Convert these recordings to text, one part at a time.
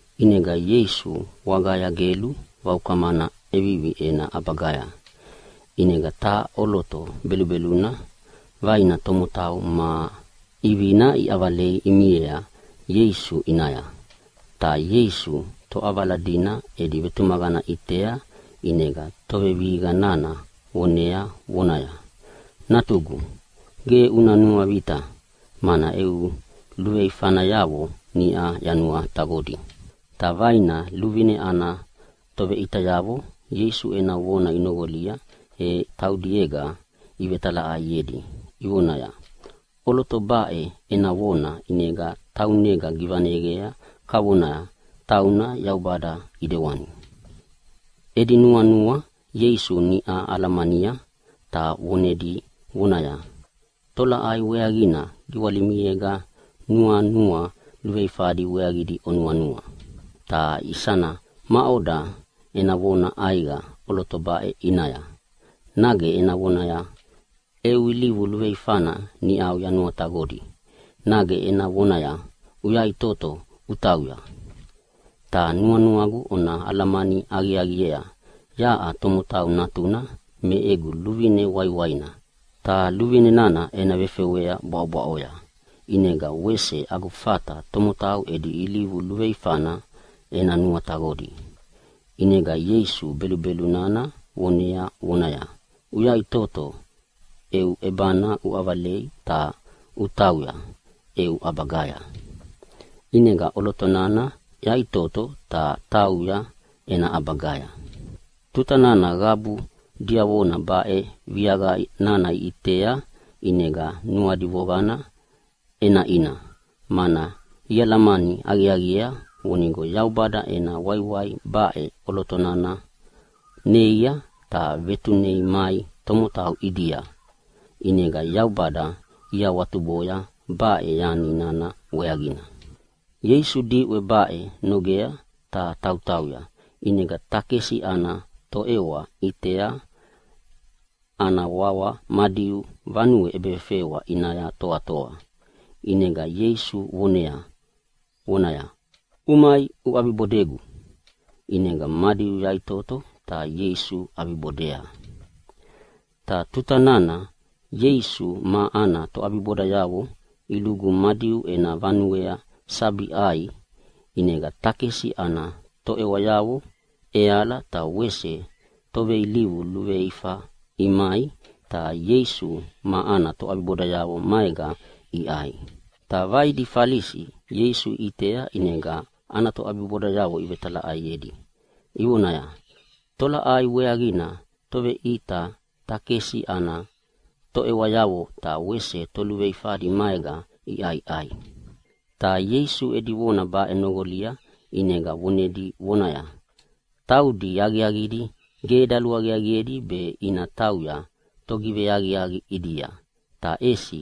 ʼInega Ieisu wagaya gelu vaukamana ʼevivi ena ʼabagaya. ʼInega taha ʼoloto belubeluna vaina tomotau ma ʼivina iʼavalei imiea Ieisu ʼinaya. Ta Ieisu toʼavala dina edi vetumaqana ʼitea ʼinega tovevihiqa nana vonea vonaya, “Natugu, ge una nuavita, mana eu luveifayavo niʼa yanuataqodi.” Ta vaina luvine ana toveʼitayavo Ieisu ena vona inoqolia, e taudiega ivetalaʼaiedi ivonaya, “ʼOloto baʼe ena vona ʼinega taunega givaneyea kavona tauna Yaubada ʼidewani.” Edi nuanua Ieisu niʼau alamania ta vonedi vonaya, “Tolaʼai weaqina giwalimiega nuanua veifadi weaqidi onuanua? Ta isana maʼoda ena vona ʼaiqa ʼoloto baʼe ʼinaya, nage ena vonaya, ‘Eu ilivu luveifana niʼau yanuataqodi’, nage ena vonaya, ‘Uyaʼitoto utauya!’ Ta nuanuagu ona alamani aqiaqiea yaʼa Tomotau Natuna me egu luvine waiwaina, ta luvine nana ena vefewea bwaʼobwaʼoya, ʼinega wese agu fata tomotau edi ilivu luveifana ena nuataqodi.” ʼInega Ieisu belubelu nana vonea vonaya, “Uyaʼitoto, eu ʼebana uʼavalei ta utauya eu ʼabagaya.” ʼInega ʼoloto nana yaʼitoto ta tauya ena ʼabagaya. Tuta nana qabu diavona baʼe viaqa nana iʼitea ʼinega nuadi voqana ʼenaʼina, mana ialamani aqiaqiea vonigo Yaubada ena waiwai baʼe ʼoloto nana neia ta vetunei mai tomotau ʼidia. ʼInega Yaubada iawatuboya baʼe yani nana weaqina. Ieisu diʼwe baʼe nogea ta tautauya, ʼinega takesi ana toʼewa ʼitea ana wawa Madiu vanue ʼebefewa ʼinaya toatoa. ʼInega Ieisu vonea vonaya, “Umai uʼabibodegu!” ʼInega Madiu yaʼitoto ta Ieisu ʼabibodea. Ta tuta nana Ieisu ma ana toʼabibodayavo ilugu Madiu ena vanuea sabi ʼai, ʼinega takesi ana toʼewayavo ʼeala be wese toveilivu veifa imai, ta Ieisu ma ana toʼabibodayavo maega iʼai. Ta vaidi Falisi Ieisu iʼitea, ʼinega ana toʼabibodayavo ivetalaʼaiedi ivonaya, “Tolaʼai weaqina emi Toveʼita takesi ana toʼewayavo ta wese toluveifadi maega iʼaiʼai?” Ta Ieisu edi vona baʼe noqolia ʼinega vonedi vonaya, “Taudi aqiaqidi ge daluaqiaqiedi be ina tauya togiveaqiaqi ʼidia, ta ʼesi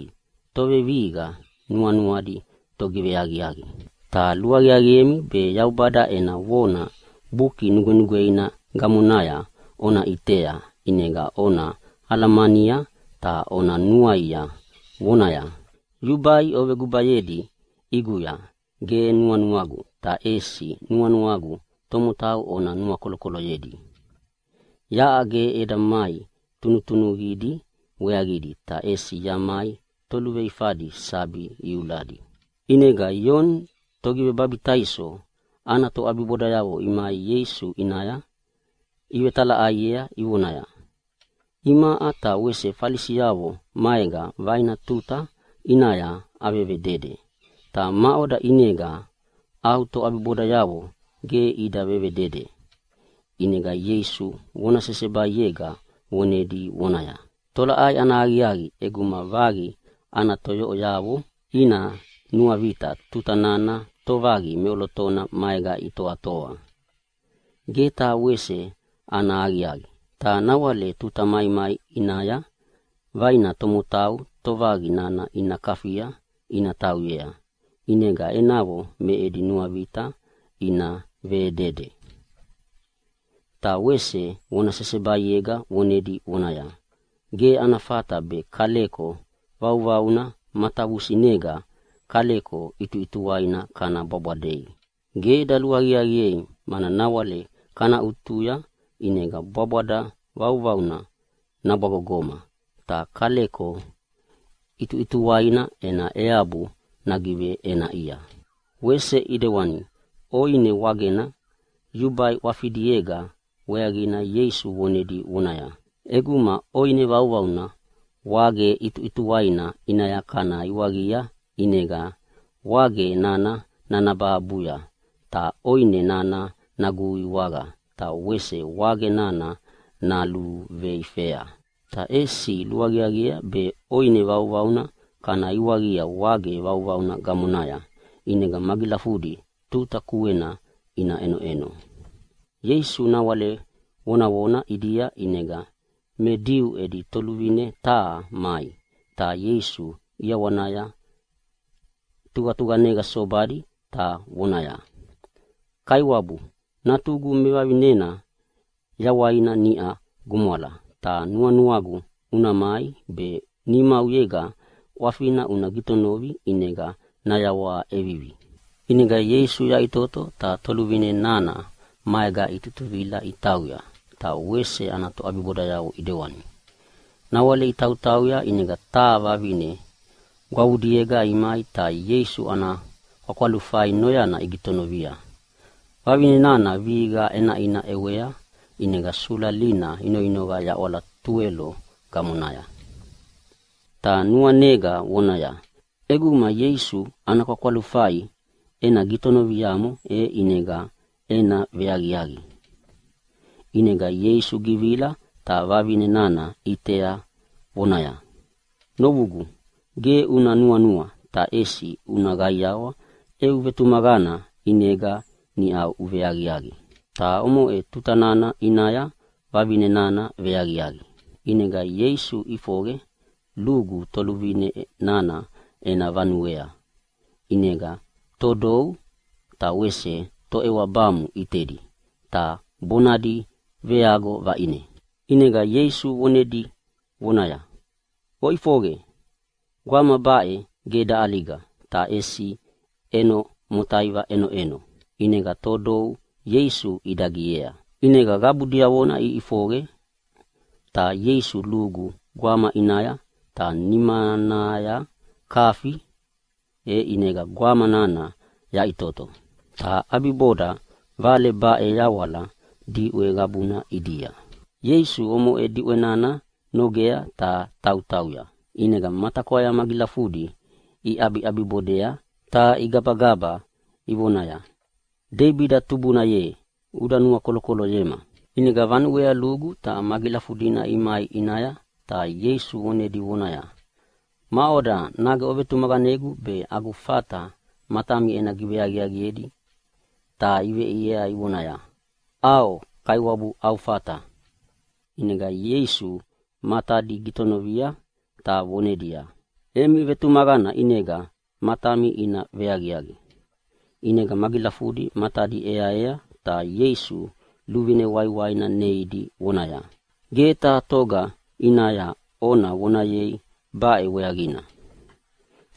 tovevihiqa nuanuadi togiveaqiaqi. Ta luaqiaqiemi be Yaubada ena vona Buki Nugwenugweina gamonaya ona ʼitea ʼinega ona alamania ta ona nuaia, vonaya, ‘Yubai ovegubayedi ʼiguya ge nuanuagu, ta ʼesi nuanuagu tomotau ona nuakolokoloyedi.’ “Yaʼa ge eda mai tunutunuqidi weaqidi, ta ʼesi yamai toluveifadi sabi iuladi.” ʼInega Ioni Togivebabitaiso ana toʼabibodayavo imai Ieisu ʼinaya ivetalaʼaiea ivonaya, “Imaʼa ta wese Falisiavo maega vaina tuta ʼinaya avevedede, ta maʼoda ʼinega au toʼabibodayavo ge ida vedede?” ʼInega Ieisu vona sesebaiega vonedi vonaya, “Tolaʼai ana aqiaqi ʼeguma vaqi ana toyoʼoyavo ina nuavita tuta nana tovaqi meʼolotona maega itoatoa? Ge taha wese ana aqiaqi! Ta nawale tuta maimai ʼinaya vaina tomotau tovaqi nana ina kafia ina tauyea, ʼinega enavo me edi nuavita ina vedede.” Ta wese vona sesebaiega vonedi vonaya, “Ge ana fata be kaleko vauvauna matavusinega kaleko ʼituʼituwaina kana bwabwadei. Ge daluaqiaqiea mana nawale kana ʼutuya ʼinega bwabwada vauvauna nabwagogoma ta kaleko ʼituʼituwainana ena eabu nagiveʼenaʼia.” Wese ʼidewani ʼoine wagena yubai ʼwafidiega weaqina Ieisu vonedi vonaya, “ʼEguma ʼoine vauvauna wage ʼituʼituwaina ʼinaya kana iwaqia ʼinega nawale wage nana nanabahabuya, ta ʼoine nana naguiwaqa ta wese wage nana naluveifa. Ta ʼesi luaqiaqiea be ʼoine vauvauna kana iwaqia wage vauvauna gamonaya, ʼinega magilafudi tuta kuena ina ʼenoʼeno.” Ieisu nawale vonavona ʼidia, ʼinega me Diu edi toluvine taha mai, ta Ieisu ʼiawanaya tuqatuqanega sobadi ta voneaya, “Kaiwabu, natugu mevavinena yawaina niʼa gumwala, ta nuanuagu una mai be nimauyega ʼwafina una gitonovi ʼinega nayawaha ʼevivi.” ʼInega Ieisu yaʼitoto ta toluvine nana maega itutuvila itauya, ta wese ana toʼabibodayavo ʼidewani. Nawale itautauya ʼinega taha vavine gwavudiega mai ta Ieisu ana kwakwalufai noyana gitonovia. Vavine nana vihiqa ʼenaʼina ʼewea ʼinega sulalina inoinoqa yaʼwala tuwelo gamonaya, ta nuanega vonaya, “ʼEguma Ieisu ana kwakwalufai ena gitonoviamo e ʼinega ena veaqiaqi.” ʼInega Ieisu givila ta vavine nana ʼitea vonaya, “Novugu, ge una nuanua ta ʼesi una qaiawa, eu vetumaqana ʼinega niʼa uveaqiaqi.” Ta omoʼe tuta nana ʼinaya vavine nana veaqiaqi. ʼInega Ieisu ʼifoqe lugu toluvine nana ena vanuea, ʼinega todou ta wese toʼewabamu ʼitedi ta bonadi veago vaʼine. ʼInega Ieisu vonedi vonaya, “Oʼifoqe! Gwama baʼe ge daʼaliga ta ʼesi ʼeno motaiva ʼenoʼeno.” ʼInega todou Ieisu idagiea. ʼInega qabu diavona iʼifoqe ta Ieisu lugu gwamana ʼinaya ta nimanaya kafi, e ʼinega gwama nana yaʼitoto. Ta ʼabiboda vale baʼe yawala diʼwe qabuna ʼidia. Ieisu omoʼe diʼwe nana nogea ta tautauya, ʼinega matakwaya magilafudi iʼabiʼabibodea ta igabagaba ivonaya, “Deibida tubuna ye, uda nuakolokoloyema!” ʼInega vanuea lugu ta magilafudina imai ʼinaya ta Ieisu vonedi vonaya, “Maʼoda, nage ovetumaqanegu be agu fata matami ena giveaqiaqiedi?” Ta iveʼiea ivonaya, “ʼAo Kaiwabu, au fata.” ʼInega Ieisu matadi gitonovia ta vonedia, “Emi vetumaqana ʼinega matami ina veaqiaqi”, ʼinega magilafudi matadi ʼeaea ta Ieisu luvine waiwaina neidi vonaya, “Ge taha toga ʼinaya ona vonayei baʼe weaqina!”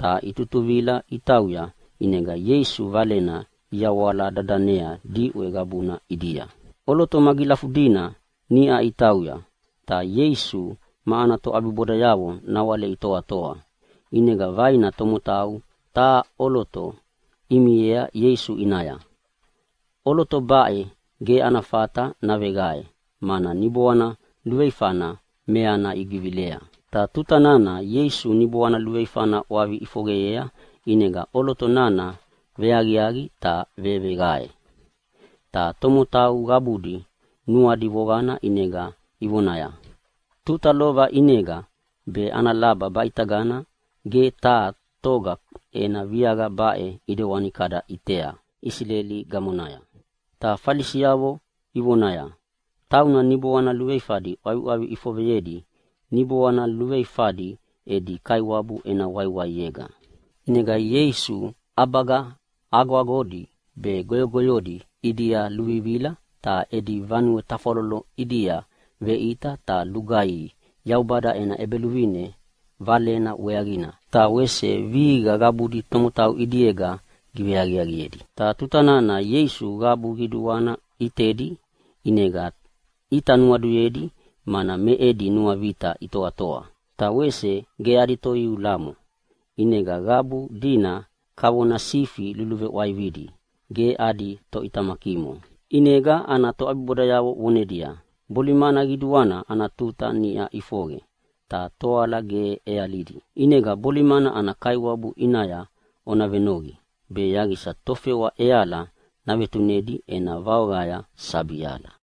Ta itutuvila itauya, ʼinega Ieisu Valena iyawala dadanea diʼwe qabuna ʼidia. ʼOloto magilafudina niʼa itauya ta Ieisu ma ana toʼabibodayavo nawale itoatoa, ʼinega vaina tomotau taha ʼoloto imiea Ieisu ʼinaya. ʼOloto baʼe ge ana fata naveqae mana niboana luveifana meana givilea. Ta tuta nana Ieisu niboana luveifana ʼwavi ʼifoqeyea ʼinega ʼoloto nana veaqiaqi ta veveqae. Ta tomotau qabudi nuadi voqana ʼinega ivonaya, “Tuta lova ʼinega be ana laba baʼitagana ge taha toga ena viaqa baʼe ʼidewani kada ʼitea Isileli gamonaya.” Ta Falisi ivonaya, “Tauna niboana luveifadi ʼwaviʼwavi ʼifoqeyedi niboana luveifadi edi kaiwabu ena waiwaiega.” ʼInega Ieisu ʼabaga agoagodi be goyogoyodi ʼidia luvivila ta edi vanue tafwalolo ʼidia veʼita ta lugaihi Yaubada ena ʼEbeluvine valena weaqina, ta wese vihiqa qabudi tomotau ʼidiega giveaqiaqiedi. Ta tuta nana Ieisu qabu qiduana ʼitedi ʼinega ʼita nuaduyedi, mana me edi nuavita itoatoa ta wese ge adi toiulamo, ʼinega qabu dina kavona sifi luluveʼwaividi ge adi toʼitamakimo. ʼInega ana toʼabibodayavo vonedia, “Bolimana qiduana ana tuta niʼa ʼifoqe ta toala ge ʼealidi, ʼinega bolimana ana Kaiwabu ʼinaya ona venoqi be yaqisa tofewa ʼeala navetunedi ena vaoqaya sabi ala.”